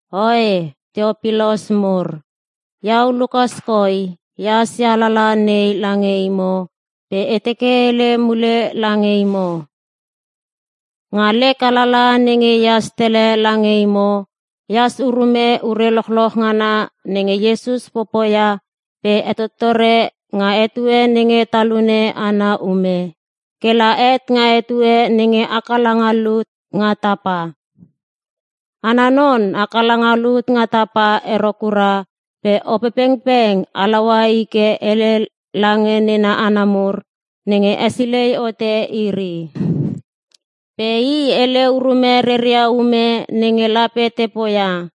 Oe, Teopilos mur, iau Lukas koi ehas ia alalaha nei lange imo pe e teke e hele mule lange imo. Nga lek alalaha nenge ehas tele lange imo, e has urume ure lochloch ngana nenge Iesus popoia pe hetottore nga etue nenge talune ana ume, kela het nga etue nenge haka langa lut nga tapa. Ana non haka langa lut nga tapa ero kura pe Opepengpeng halaua i ke hele lange nena hana mur nenge hesilei hote iri. Pe i hele urume reria ume nenge lape te poia.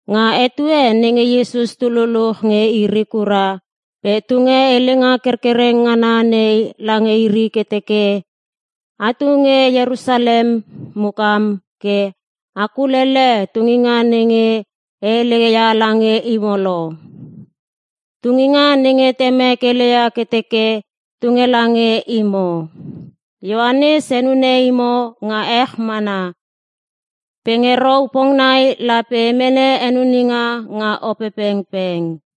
Nga etue nenge Iesus tu luluch nge iri kura pe tunge helenga kerkereng ngana nei lange iri ke teke, “Atu nge Ierusalem mukam ke a kulele tunginga nenge e hele ia lange imo lo. Tunginga nenge Temek heleia ke teke tunge lange imo. Ioanes henune imo nga ech mana. Pe nge rou pongnai lape a mene henuninga nga Opepengpeng.”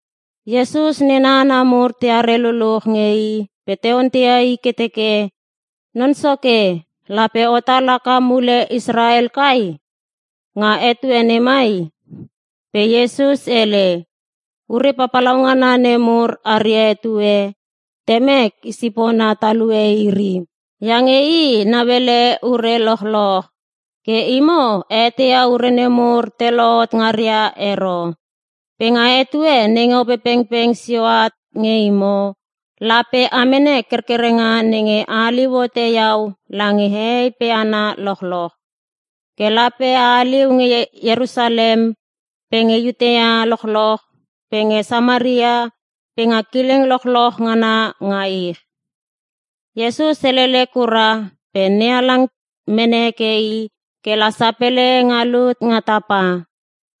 Iesus nena hana mur teare luluch nge i pe te onteia i ke te teke, “Non Soke, lape otal haka mule Israel kai? Nga etue nemai?” Pe Iesus hele, “Ure papalaungana nemur aria etue, Temek i sipona talue iri. Iange i nauele ure lochloch. Ke imo a eteia ure nemur te lohot ngaria ero. Pe nga etue nenge Opepengpeng sio at nge imo, lape a mene kerkerenga nenge a haliu hote iau lange hehei pe hana lochloch. Ke lape a haliu nge Ierusalem pe nge Iutea lochloch pe nge Samaria pe nga kileng lochloch ngana nga ich.” Iesus helele kura pe NeHalang mene heke i ke la sapele nga lut nga tapa.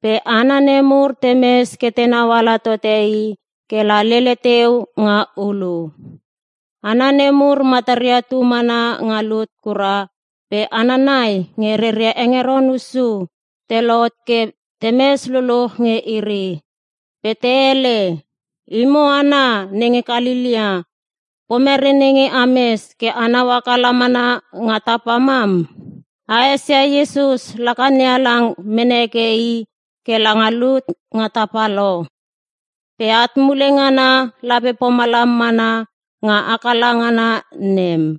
Pe hana nemur temes ke tenau ala tote i kela lele teu nga ulu. Hana nemur mataria tu mana nga lut kura pe hana nai nge reria hengeron hussu te lohot ke temes luluch nge iri. Pe te hele, “Imo hana nenge Kalelea, pomere nenge ames ke anau haka lamana nga tapa mam? A esia Iesus laka NeHalang mene heke i ke la nga lut nga tapa lo! Pe at mule ngana, lape pomalam mana nga haka la ngana nem.”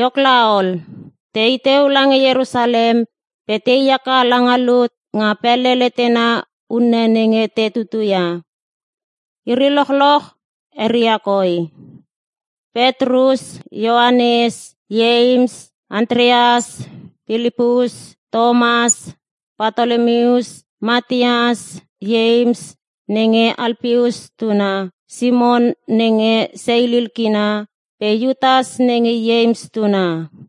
Iok laol, tei teu lange Ierusalem pe tei haka langa lut nga pele letena unne nenge te tutuia. Iri lochloch eria koi: Petrus, Ioanes, Ieims, Antreas, Pilipus, Tomas, Patolomius, Mateus, Ieims nenge Alpeus tuna, Simon nenge seilil kina, pe Iutas nenge Ieims tuna.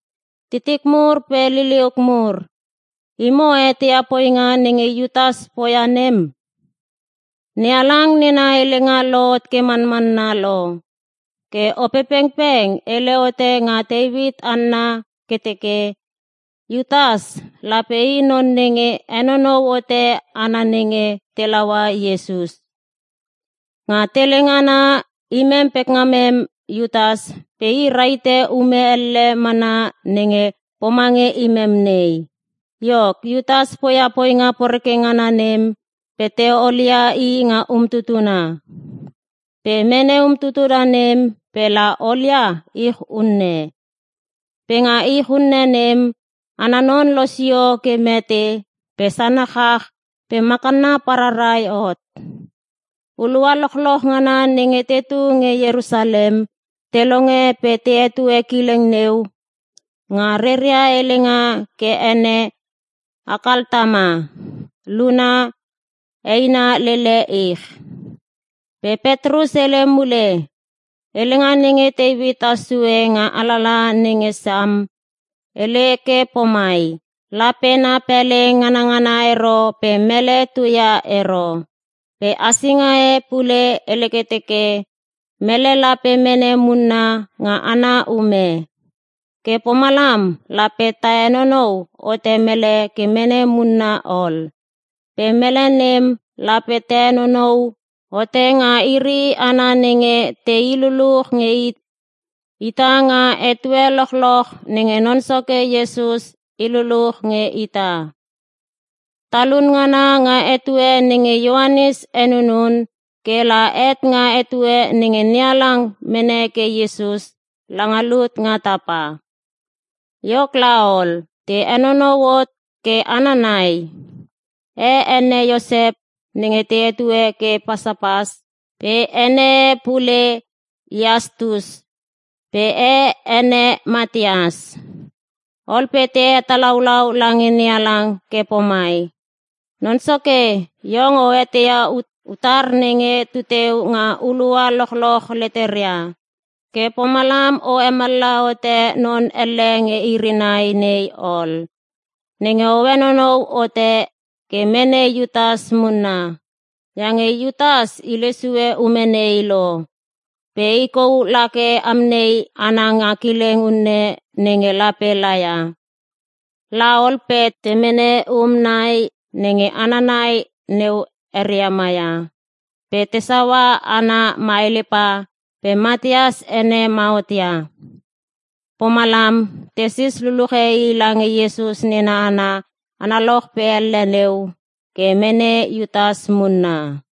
“Titik mur pe liliuk mur, imo a eteia poinga nenge Iutas poia nem. NeHalang nena helenga lohot ke manmanna lo. Ke Opepengpeng hele hote nga Teuit anna ke teke, Iutas lape i non nenge henonou hote hana nenge te laua Iesus. Nga tele ngana, imem pekngamem Iutas pe i rahite ume elle mana nenge pomange imem nei.” (Iok Iutas poia poinga poreke ngana nem pe te olia i nga umtutuna. Pe mene umtutuna nem pela olia ich unne. Pe nga ich unne nem, ana non losio ke mete pe sana chach pe makanna pararai hot. Hulua lochloch ngana nenge tetu nge Ierusalem, te longe pe te hetue kileng neu nga reria helenga ke ene Akaltama. Luna: Eina lele ich.) Pe Petrus hele mule, “Helenga nenge Teuit has sue nga alalaha nenge Sam hele ke pomai, “‘Lape na pele nganngana ero pe mele tuia ero.’” Pe hasinga e pule hele ke teke, “‘Mele lape mene munna nga ana ume.’ Ke pomlam lape ta henonou hote mele ke mene munna ol. Pe mele nem lape ta henonou hote nga iri hana nenge te i lululuch nge ita nga etue lochloch nenge Non Soke Iesus i luluch nge ita. Talun ngana nga etue nenge Ioanes henunun, ke la het nga etue nenge NeHalang mene heke Iesus langa lut nga tapa.” Iok laol, te henonou hot ke hana nai. E ene Iosep nenge te hetue ke Pasapas (pe ene e pule Iastus). Pe e ene Mateas. Ol pe te hetalaulau lange NeHalang ke pomai, “Non Soke iong o eteia utar nenge tuteu nga hulua lochloch leteria. Ke pomalam o hemallaha hote non elle nge iri nai nei ol, nenge o henonou hote ke mene Iutas munna. Iange Iutas hile sue ume nei lo. Pe i kou lake amnei ana nga kileng unne nenge lape laia.” Laol pe te mene um nai nenge hana nai neu eria maia, pe te saua ana maelpa pe Mateas ene mahot ia. Pomalam tesis luluche i lange Iesus nena hana analoch pe elle neu, ke mene Iutas munna.